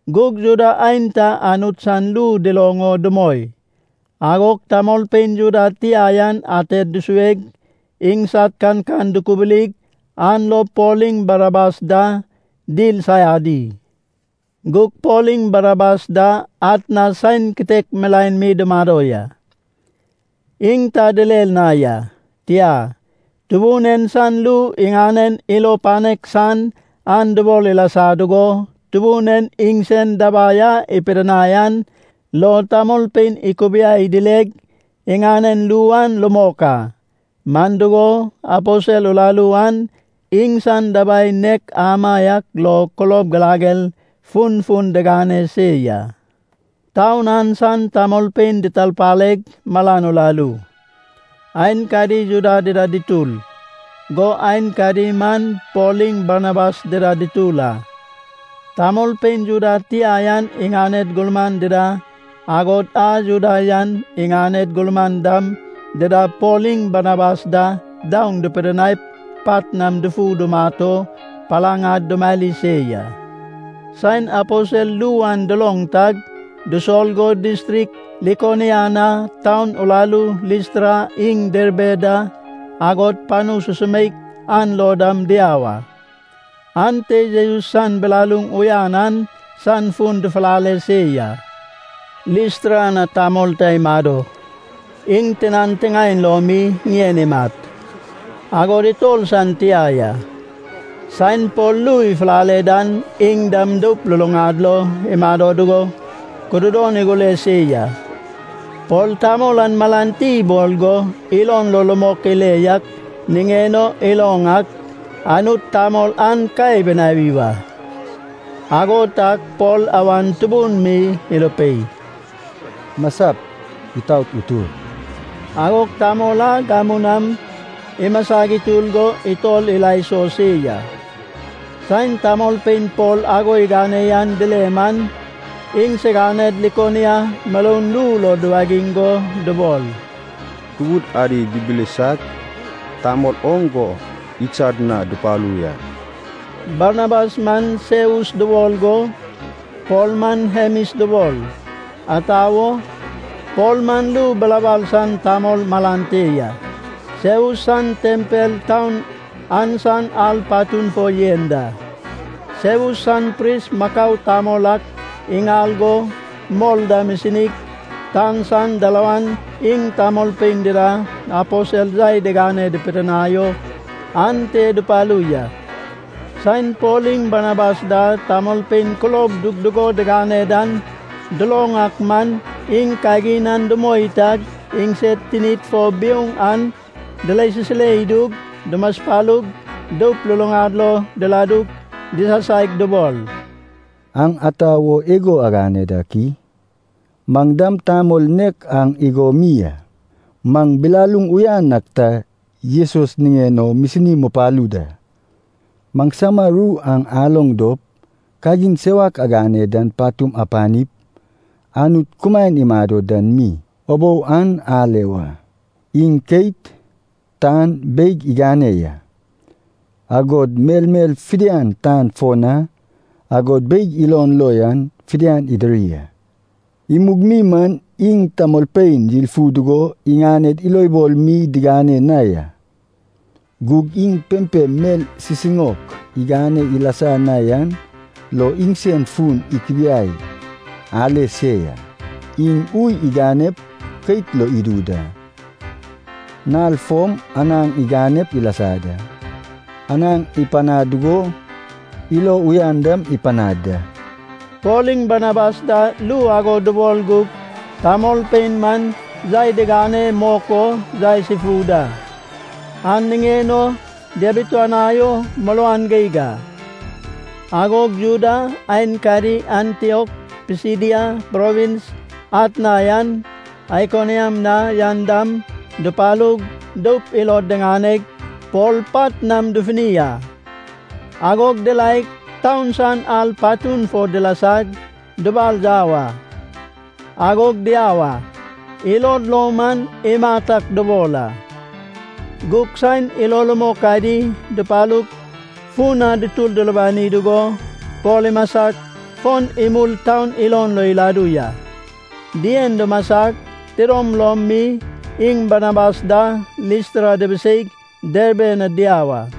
Gug Juda aenta Anut san ru duloŋ o dumoi, agog tamolpein Juda tia yan ated dusueg, iŋsad kankan dukubulig an lo Pol iŋ Barnabas da dil saiadi. Gug Pol iŋ Barnabas da atna saen kitek milaen mi dumado ya. Iŋ ta direr na ya, tia, Tubun en san ru iŋanen ilo panek san an dubol ilasa dugo, Tubun en iŋsen dabai a ipidinai an lo tamolpein ikubiai dileg iŋanen ru an rumok a. Man dugo, aposel uraru an iŋsan dabai nek amaiak lo kulob girager funfun digane se ya. Taun an san tamolpein ditarpaleg malan uraru. Aenkadi Juda dida dutur, go aenkadi man Pol iŋ Barnabas dida dutur a. Tamolpein Juda tia an iŋaned gurman dida, agod a Juda yan iŋaned gurman dam dida Pol iŋ Barnabas da daoŋ dipidinaip pat nam dufup dumat o palaŋ ad dumari se ya. Saen aposel ru an duloŋ tag, dusol go distrik Likonia na taun uraru Listra iŋ Derbe da, agod panu susumeik an lo dam diau a. Ante Jesus san bilaluŋ uyan an san fun dufulale se ya. Listra na tamol ta imado. Iŋ tinan tiŋaen lo mi ŋien imat, agod itor san tia ya. Saen Pol ru ifulale dan iŋ dam doup luluŋad lo imado dugo kududon igure se ya. Pol tamol an malan ti ibol go, ilon lo rumok ile yak niŋen o iloŋ ak, Anut tamol an ka ibinawi wa. Ago tag Pol awan tubun mi irupei, “Masap! Itaot utur!” Agog tamol an gamu nam imasag itur go itor ila iso se ya. Saen tamolpein Pol ago igane yan dile man, iŋsiganed Likonia muroun ru lo duwagiŋ go dubol, “Tubud adi dibilisag, tamol oŋ go idsad na dupalu ya.” Barnabas man Seus dubol go Pol man Hemis dubol. Ata wo? Pol man ru bilabal san tamol malan te ya. Seus san tempel taun an san ar patun fo yen da. Seus san pris makau tamol ak iŋal go mor dam isinig, tan san dalawan iŋ tamolpein dida aposel yai digane pidinai o ante dupalu ya. Saen Pol iŋ Barnabas da tamolpein kulob dugdugo digane dan duloŋ ak man, iŋ kagin an dumoi tag iŋsed tinid fo biouŋ an dirasisire idug, dumaspalug, doup luluŋad lo diladug disasaig dubol, “Aŋ ata wo igo agane dak i? Maŋ dam tamol nek aŋ igo mi a. Maŋ bilaluŋ uyan ak ta Jesus niŋen o misini mupalu da. Maŋsama ru an aloŋ dop kagin sewak agane dan patum apanip, Anut kumaen imado dan mi ubou an ale wa. Iŋ keit, tan, beig igane ya. Agod melmel fidian tan fo na, agod beig ilon lo yan fidian idiri a. Imug mi man iŋ tamolpein yilfu dugo iŋaned ilobol mi digane na ya. Gug iŋ pempem mel sisiŋaok igane ilasa na yan lo iŋsen fun ikubiai ale se ya. Iŋ ui iganep, keit lop idu da. Nal fom anaŋ iganep ilasa da. Anaŋ ipanaŋ dugo ilo uyan dam ipanaŋ da.” Pol iŋ Barnabas da ru ago dubol gug tamolpein man yai digane mok o yaes ifu da, an niŋen o diabituanai o muruan geig a. Agog Juda aenkadi Antiok Pisidia provins atna yan, Aikoniam na yan dam dupalug, doup ilod diŋaneg, Pol pat nam dufuni a. Agog diraeg, taun san ar patun fo dilasag, dibal yau a, agog diau a. Ilod lo man imat ak dubol a. Gug saen ilo rumok adi dupalug fun na dutur dulubani dugo, Pol imasag fon imul taun ilon lo iladu ya. Dien dumasag, tidom lom mi iŋ Barnabas da Listra dibiseig Derbe na diau a.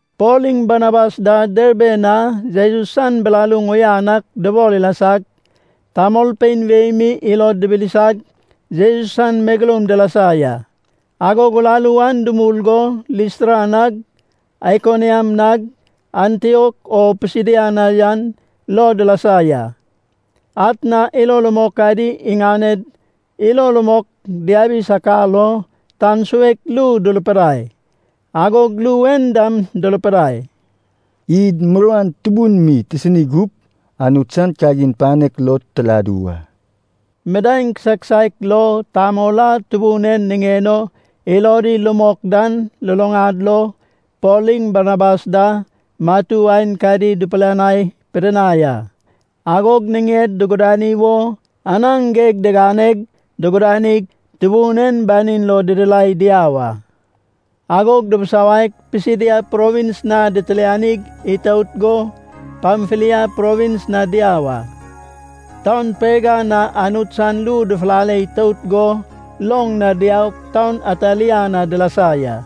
Pol iŋ Barnabas da Derbe na Jesus san bilaluŋ uyan ak dubol ilasag, tamolpein wei mi ilod dibilisag, Jesus san megeloum dilasa ya. Agog uraru an dumul go, Listra nag, Aikoniam nag, Antiok o Pisidia na yan lo dilasa ya. Atna ilo rumok adi iŋaned ilo rumok diabi sakar o tan suek ru durupidai, agog ru en dam durupidai, “Id muruan tubun mi tisini gup, Anut san kagin panek lo tiladu wa.” Midaeŋ kisaek kisaek lo, tamol a Tubun en niŋen o ilodi rumok dan luluŋad lo Pol iŋ Barnabas da matu aenkadi dipilianai pidinai a. Agog niŋed dugudani wo anaŋ geg diganeg, dugudanig, Tubun en banin lo didirai diau a. Agog dibisawaig Pisidia provins na ditilianig itout go Pamfilia provins na diau a. Taun Perga na Anut san ru dufulale itout go loŋ na diaug taun Atalia na dilasa ya.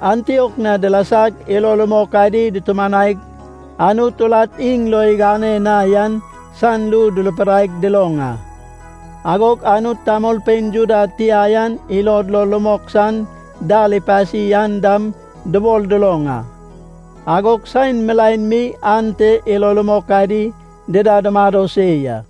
Antiok na dilasag ilo rumok adi dutumanaig, Anut urat iŋ lo igane na yan san ru durupidaig duloŋ a. Agog Anut tamolpein Juda tia yan ilod lo rumok san dal ipasi an dam dubol duloŋ a. Agog saen milaen mi ante ilo rumok adi dida dumado se ya.